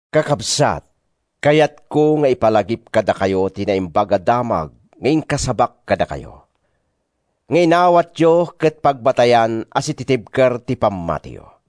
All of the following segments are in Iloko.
Kakabsat, kayatko nga ipalagip kadakayo ti Naimbag a Damag nga inkasabak kadakayo, nga inawatyo ket pagbatayan a sititibker ti pammatiyo.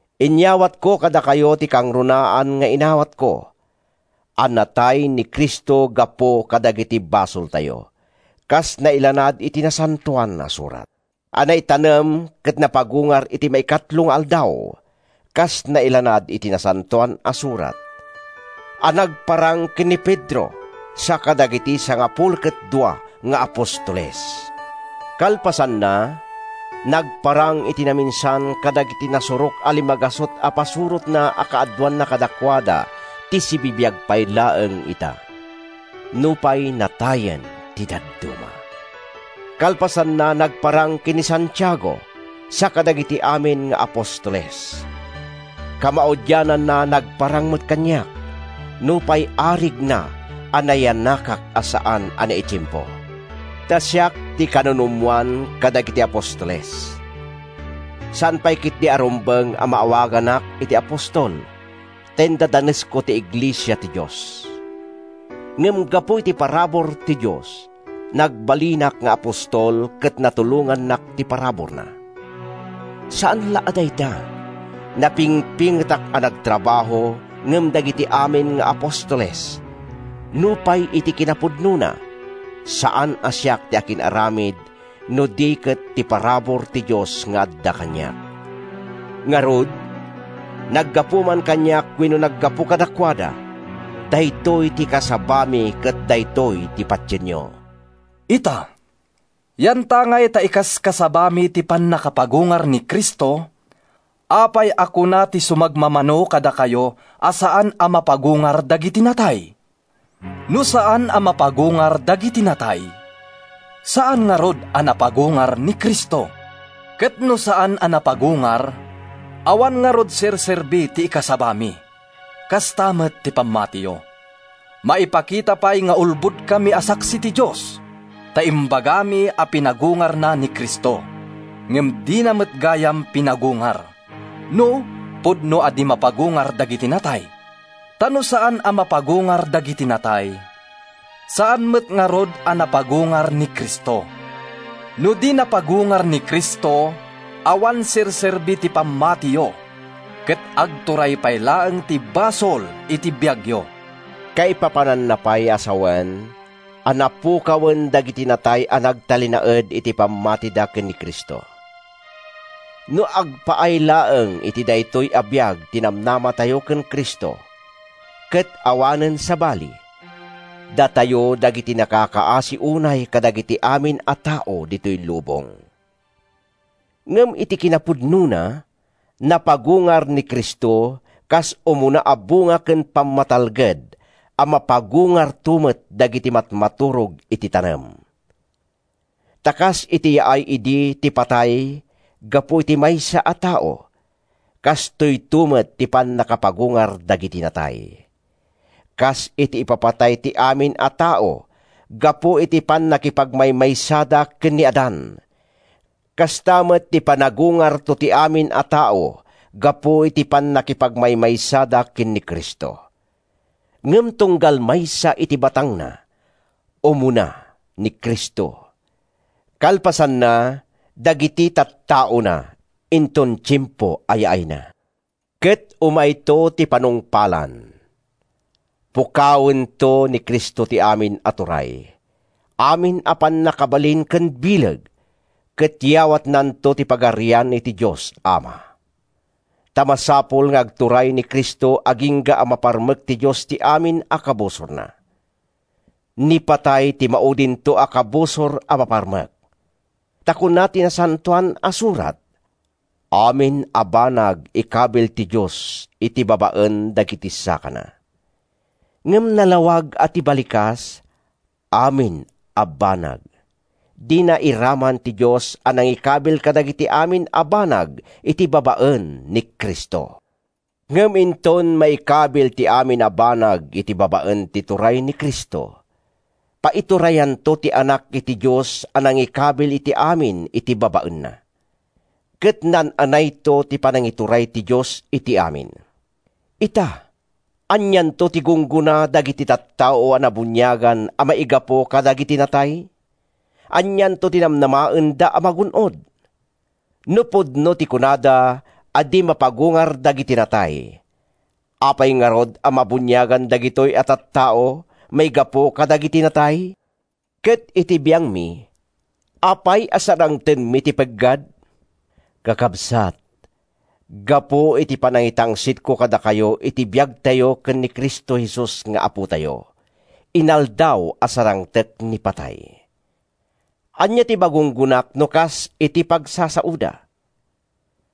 Inyawatko kadakayo ti kangrunaan nga inawatko: a natay ni Cristo gapu kadagiti basoltayo, kas nailanad iti Nasantoan a Surat; a naitanem ket napagungar iti maikatlo nga aldaw, kas nailanad iti Nasantoan a Surat; a nagparang ken ni Pedro sa kadagiti sangapulo ket dua nga apostoles. Kalpasanna, nagparang iti naminsan kadagiti nasurok a limagasut a pasurotna a kaaduanna kadakuada ti sibibiag pay laeng ita, nupay natayen ti dadduma. Kalpasanna, nagparang ken ni Santiago sa kadagiti amin nga apostoles. Kamaudiananna, nagparang met kaniak, nupay arigna a nayanakak a saan a naitiempo. Ta siak ti kanunumoan kadagiti apostoles. Saan pay ketdi a rumbeng a maawaganak iti apostol ta indadanesko ti iglesia ti Dios. Ngem gapu iti parabur ti Dios, nagbalinak nga apostol ket natulongannak ti paraburna. Saan la a dayta, napingpingetak a nagtrabaho ngem dagiti amin nga apostoles, nupay iti kinapudnona, saan a siak ti akin-aramid no di ket ti parabur ti Dios nga adda kaniak. Ngarud, naggapu man kaniak wenno naggapu kadakuada, daytoy ti ikasabami ket daytoy ti patienyo. Ita, yantangay ta ikaskasabami ti pannakapagungar ni Cristo, apay a kuna ti sumagmamano kadakayo a saan a mapagungar dagiti natay? No saan a mapagungar dagiti natay, saan ngarud a napagungar ni Cristo. Ket no saan a napagungar, awan ngarud ti serserbi ti ikasabami, kasta met ti pammatiyo. Maipakita pay nga ulbodkami a saksi ti Dios, ta imbagami a pinagungarna ni Cristo—ngem dina met gayam pinagungar, no pudno a di mapagungar dagiti natay. Ta no saan a mapagungar dagiti natay, saan met ngarud a napagungar ni Cristo. No di napagungar ni Cristo, awan serserbi ti pammatiyo ket agturay pay laeng ti basol iti biagyo. Kaipapananna pay a sawen a napukawen dagiti natay a nagtalinaed iti pammatida ken ni Cristo. No agpaay laeng iti daytoy a biag ti namnamatayo ken Cristo, ket awanen sabali, datayo dagiti nakakakaasi unay kadagiti amin a tao ditoy lubong. Ngem iti kinapudnona, napagungar ni Cristo kas umuna a bunga ken pammatalged a mapagungarto met dagiti matmaturog iti tanem. Ta kas iti yaay idi ti patay gapu iti maysa a tao, kastoyto met ti pannakapagungar dagiti natay. Kas iti ipapatay ti amin a tao gapu iti pannakipagmaymaysada ken ni Adan, kasta met ti panagungarto ti amin a tao gapu iti pannakipagmaymaysada ken ni Cristo. Ngem tunggal maysa iti batangna: umuna, ni Cristo; kalpasanna, dagiti tattaona, inton tiempo a yaayna. Ket umayto ti panungpalan. Pukawento ni Cristo ti amin a turay, amin a pannakabalin ken bileg, ket yawatnanto ti Pagarian iti Dios Ama. Ta masapul nga agturay ni Cristo agingga a maparmek ti Dios ti amin a kabusorna. Ni patay ti maudinto a kabusor a maparmek. Ta kuna ti Nasantoan a Surat: “Amin a banag ikabil ti Dios iti babaen dagiti sakana.” Ngem nalawag a ti balikas “amin a banag,” dina iraman ti Dios a nangikabil kadagiti amin a banag iti babaen ni Cristo. Ngem inton maikabil ti amin a banag iti babaen ti turay ni Cristo, paiturayanto ti Anak iti Dios a nangikabil iti amin iti babaenna. Ket naan-anayto ti panangituray ti Dios iti amin. Ita, anianto ti gunggona dagiti tattao a nabuniagan a maigapu kadagiti natay? Anianto ti namnamaenda a magun-od? No pudno ti kunada a di mapagungar dagiti natay, apay ngarud a mabuniagan dagitoy a tattao maigapu kadagiti natay? Ket iti biangmi, apay a sarangtenmi ti peggad? Kakabsat, gapu iti panangitangsitko kadakayo iti biagtayo ken ni Cristo Jesus nga Apotayo, inaldaw a sarangtek ni patay. Ania ti magunggonak, no kas iti pagsasaoda,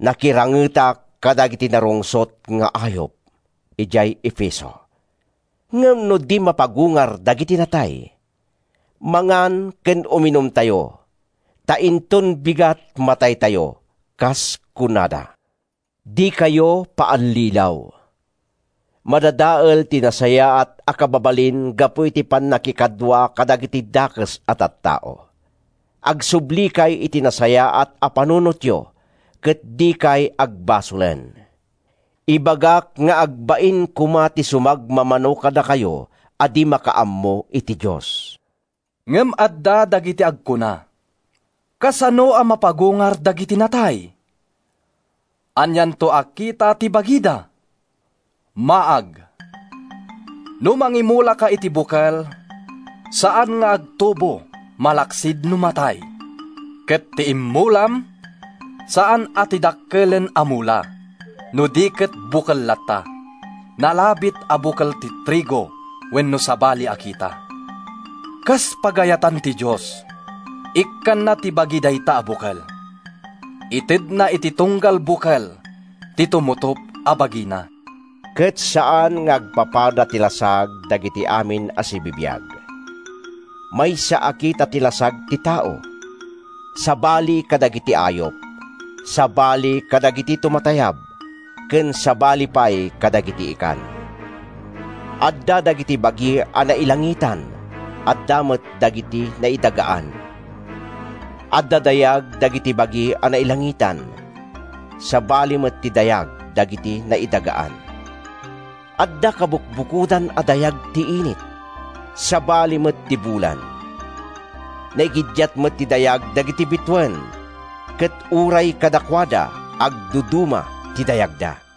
“Nakirangetak kadagiti narungsot nga ayup” idiay Efeso? Ngem no di mapagungar dagiti natay, “Mangan ken uminumtayo, ta inton bigat, mataytayo,” kas kunada. Dikayo paallilaw: “Madadael ti nasayaat a kababalin gapu iti pannakikadua kadagiti dakes a tattao.” Agsublikay iti nasayaat a panunotyo ket dikay agbasolen. Ibagak nga agbain koma ti sumagmamano kadakayo a di makaammo iti Dios. Ngem adda dagiti agkuna, “Kasano a mapagungar dagiti natay? Anianto a kita ti bagida?” Maag! No mangimulaka iti bukel, saan nga agtubo malaksid no matay. Ket ti immulam, saan a ti dakkelen a mula, no di ket bukel latta, nalabit a bukel ti trigo wenno sabali a kita. Kas pagayatan ti Dios, ikkanna ti bagi dayta a bukel. Itedna iti tunggal bukel ti tumutop a bagina. Ket saan nga agpapada ti lasag dagiti amin a sibibiag. Maysa a kita ti lasag ti tao, sabali kadagiti ayup, sabali kadagiti tumatayab, ken sabali pay kadagiti ikan. Adda dagiti bagi a nailangitan, adda met dagiti naidagaan. Adda dayag dagiti bagi a nailangitan. Sabali met ti dayag dagiti naidagaan. Adda kabukbukodan a dayag ti init; sabali met ti bulan. Naigiddiat met ti dayag dagiti bituen, ket uray kadakuada, agduduma ti dayagda.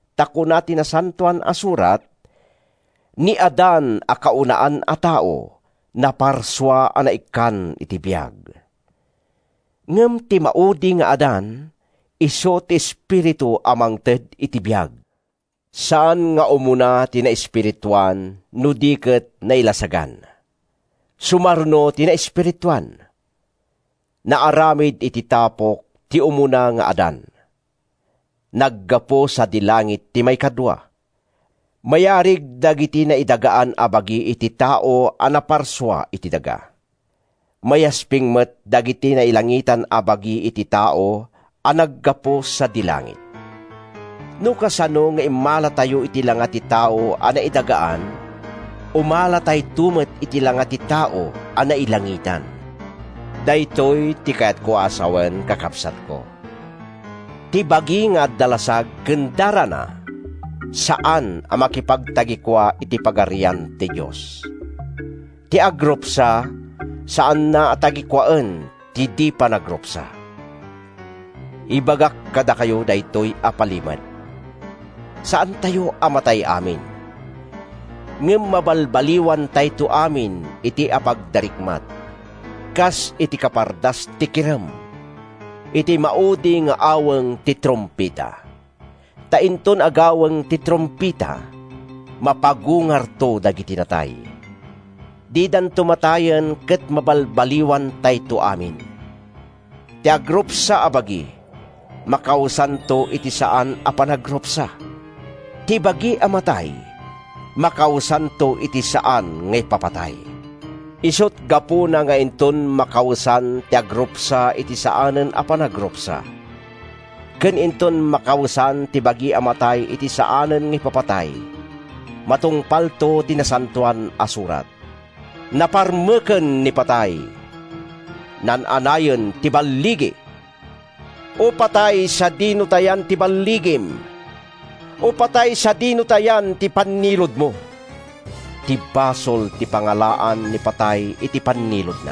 Ta kuna ti Nasantoan a Surat: “Ni Adan a kaunaan a tao, naparsua a naikkan iti biag.” Ngem ti maudi nga Adan, isu ti Espiritu a mangted iti biag. Saan nga umuna ti naespirituan no di ket nailasagan. Sumaruno ti naespirituan. Naaramid iti tapok ti umuna nga Adan. Naggapu sadi langit ti maikadua. Mayarig dagiti naidagaan a bagi iti tao a naparsua iti daga. Mayasping met dagiti nailangitan a bagi iti tao a naggapu sadi langit. No kasano nga immalatayo iti langa ti tao a naidagaan, umalatayto met iti langa ti Tao a nailangitan. Daytoy ti kayatko a sawen, kakabsatko: Ti bagi nga adda lasag ken darana, saan a makipagtagikua iti Pagarian ti Dios. Ti agrupsa, saanna a tagikuaen ti di panagrupsa. Ibagak kadakayo daytoy a palimed: saantayto a matay amin, ngem mabalbaliwantayto amin iti apagdarikmat, kas iti kapardas ti kirem, iti maudi nga aweng ti trumpeta. Ta inton agaweng ti trumpeta, mapagungarto dagiti natay. Didanto matayen ket mabalbaliwantayto amin. Ti agrupsa a bagi, makawesanto iti saan a panagrupsa. Ti bagi a matay, makawesanto iti saan nga ipapatay. Isut’ gapuna nga inton makawesan ti agrupsa iti saanen a panagrupsa, ken inton makawesan ti bagi a matay iti saanen nga ipapatay, matungpalto ti Nasantoan a Surat: “Naparmeken ni Patay; naan-anayen ti balligi!” “O Patay, sadino ti yan ti balligim? O Patay, sadino ti yan ti panniludmo?” Ti basol ti pangalaan ni patay iti panniludna.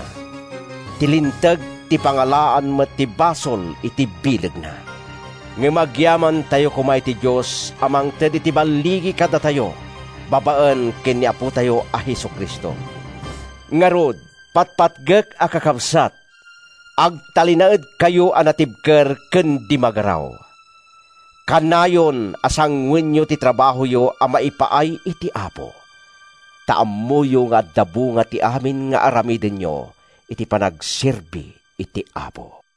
Ti Linteg ti pangalaan met ti basol iti bilegna. Ngem agyamantayo koma iti Dios a mangted iti balligi kadatayo babaen ken ni Apotayo a Jesu-Cristo. Ngarud, patpatgek a kakabsat, agtalinaedkayo a natibker ken di magaraw. Kanayon a sangoenyo ti trabahoyo a maipaay iti Apo, ta ammoyo nga adda bunga ti amin nga aramidenyo iti panagserbi iti Apo.